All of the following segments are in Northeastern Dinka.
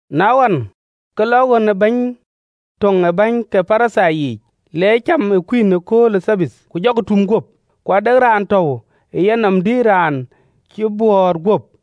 Na ɣɔn, ke lɔ ɣön ë bɛ̈ny tök ë bäny ke Parithai yiic, le cam ë kuïn ëkööl ë Thabath, ku jɔkï toom guöp. Ku ade raan tɔ̈u ë yenɔm, dï, raan cï bɔ̈ɔ̈t guöp.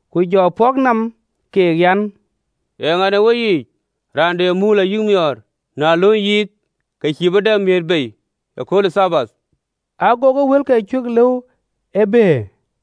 Ku jɔ pɔ̈k nɔm keek, an, “Eeŋa në weyiic, raan de muul ayï thɔn, na lööny yiith, ke cïï bï dap miëët bei ëkööl ë Thabath?” Agokï wëlkë cuö lëu ë bëër.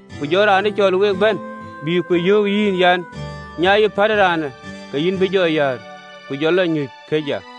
ku jɔ raan ë cɔl week bɛ̈n, bï ku yöök yïn an, ‘Nyai, pätë raanë.’ Ke yïn bï jɔ yäär, ku jɔ lɔ nyuc këc ya.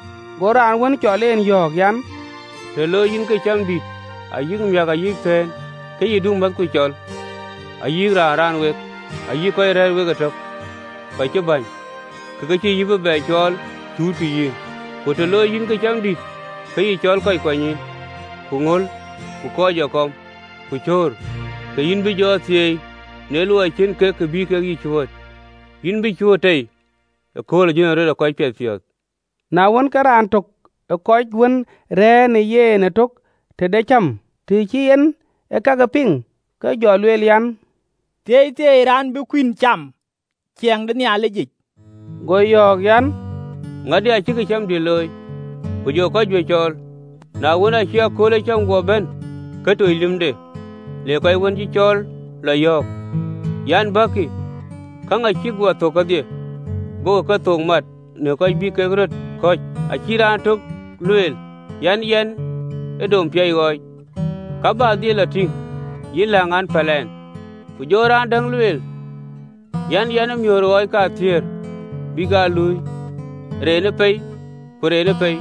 Go raan wën cɔl en yɔ̈ɔ̈k an, “Të looi yïn këcamdït ayï miäk ayï thëën, ke yï du määthku cɔl, ayï kɔc raan wek, ayï kɔc rɛ̈ɛ̈r wek ëtök kɔc cï bäny, ke ke cïï yï bï bɛ cɔɔl, cuutkï yïn. Ku të looi yïn këcamdït, ke yï cɔl kɔc kuanynyïïn, ku ŋöl, ku kɔc ee kɔm, ku cöör: ke yïn bï jɔ thieei, në luɔi cïn kek kë bï kek yï cuööt: yïn bï cuööt tei ëkööl ë jönërɔt ë kɔc piɛthpiɔ̈ɔ̈th.” Na wën, ke raan tök ë kɔc wën rɛ̈ɛ̈r në yen ëtök tëde cäm, të cï en ee kakë piŋ, ke jɔ lueel an, “Thieithieei raan bï kuïn cam ë ciɛɛŋ de Nhialicic!” Go yɔ̈ɔ̈k an, “Ŋadï acï këcamdït looi, ku jɔ kɔc juëc cɔɔl. Na wën, aacï kööl ë cäm guɔ bɛ̈n, ke toc lïmde le kɔc wën cï cɔɔl lɔ yɔ̈ɔ̈k, an, ‘Bäkï, käŋ acïk guɔ thök kedhie!’ Gokï kethook mat në köc bï kek röt kɔ̈c. Acï raan tök lueel an, ‘Yɛn ë dom piac ɣɔɔc, ka bä dhil lɔ tïŋ. Yïn läŋ, an päl ɛn.’ Ku jɔ raan däŋ lueel an, ‘Yɛn ë miöör ɣɔɔc kathiëër, bïk aa luui, renë pei ku renë pei,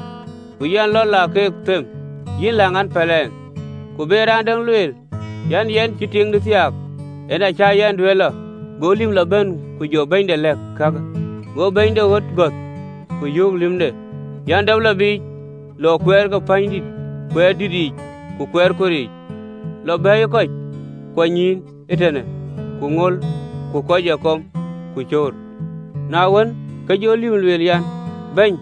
ku yɛn lɔ la keek them: yïn läŋ an, päl ɛn.’ Ku be däŋ lueel an, “Yɛn cï tiiŋdï thiaak, en acä yɛn duëër lɔ.’ Go lïm lɔ bɛ̈n ku jɔ bɛ̈nyde lɛ̈k kakë. Go bɛ̈ny de ɣöt gɔ̈th, ku yöök lïmde an, ‘Dap lɔ biic lɔ kuɛɛr ke pänydït kuɛɛr dït yiic ku kuɛɛr kor yiic, lɔ bɛ̈ɛ̈iyë kɔc kuanynyïïn ee tënë, ku ŋöl, ku kɔc ë kɔm, ku cöör.’ Na wën, ke jɔ lïm lueel an, ‘Bɛ̈ny,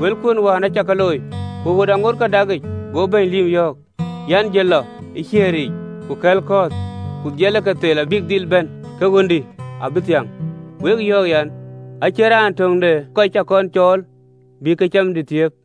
wëlkuön wën acä ka looi, ku ɣöt aŋoot ke dakic.’ Go bɛ̈ny lïm yɔ̈ɔ̈k an, ‘Jël lɔ ë kuɛɛr yiic ku kɛ̈l kɔ̈ɔ̈th, ku dhil ke thel abïk dhil bɛ̈n, ke ɣöndï abï thiäŋ. Wek yɔ̈ɔ̈k an, acïn raan töŋ de kɔc cä kɔn cɔɔl bï këcamdï thiëëp.”’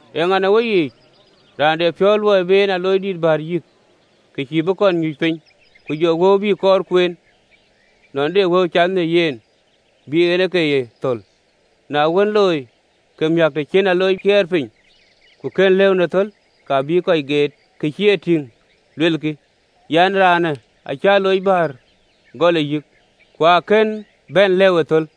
Eeŋa në weyiic, raan de piɔ̈u luɔi bï en aloocdïït bäär yïk, ke cïï bï kɔn nyuc piny, ku jɔ wëu bï kɔɔr kueen, nɔn de wëu cath në yen bï en ke ye thöl? Na kën e looi, ke miäk, të cï en alooc kiɛɛr piny, ku kën lëu në thöl, ka bïï kɔc deet, kɔc cï e tïŋ, luelkï an, ‘Raanë acï aloocdïït bäär gɔl ë yïk, ku akën bɛ̈n lëu ë thöl!’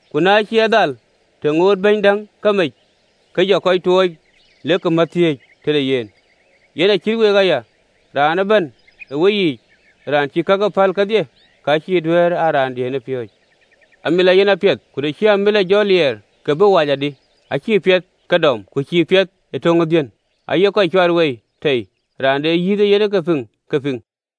Ku na cï ë dhal, të ŋootë bɛ̈ny däŋ ke mec, ke jɔ kɔc tuɔɔc lek mät thiëëc tëde yen. Yen acït week aya, raan ëbɛ̈n ë weyiic raan cïï kake päl kedhie, ka cïï duëër a raandiën ë piööcë.” “Amilɔ yen apiɛth: ku të cï amilɔ jɔ liɛɛr, ke bï bɛ wac adï? Acïï piɛth ke dom, ku cïï piɛth ke töŋ ë dhiën, aye kɔc cuat wei tei. Raan de yïth ee yen ke piŋ, ke pïŋ!”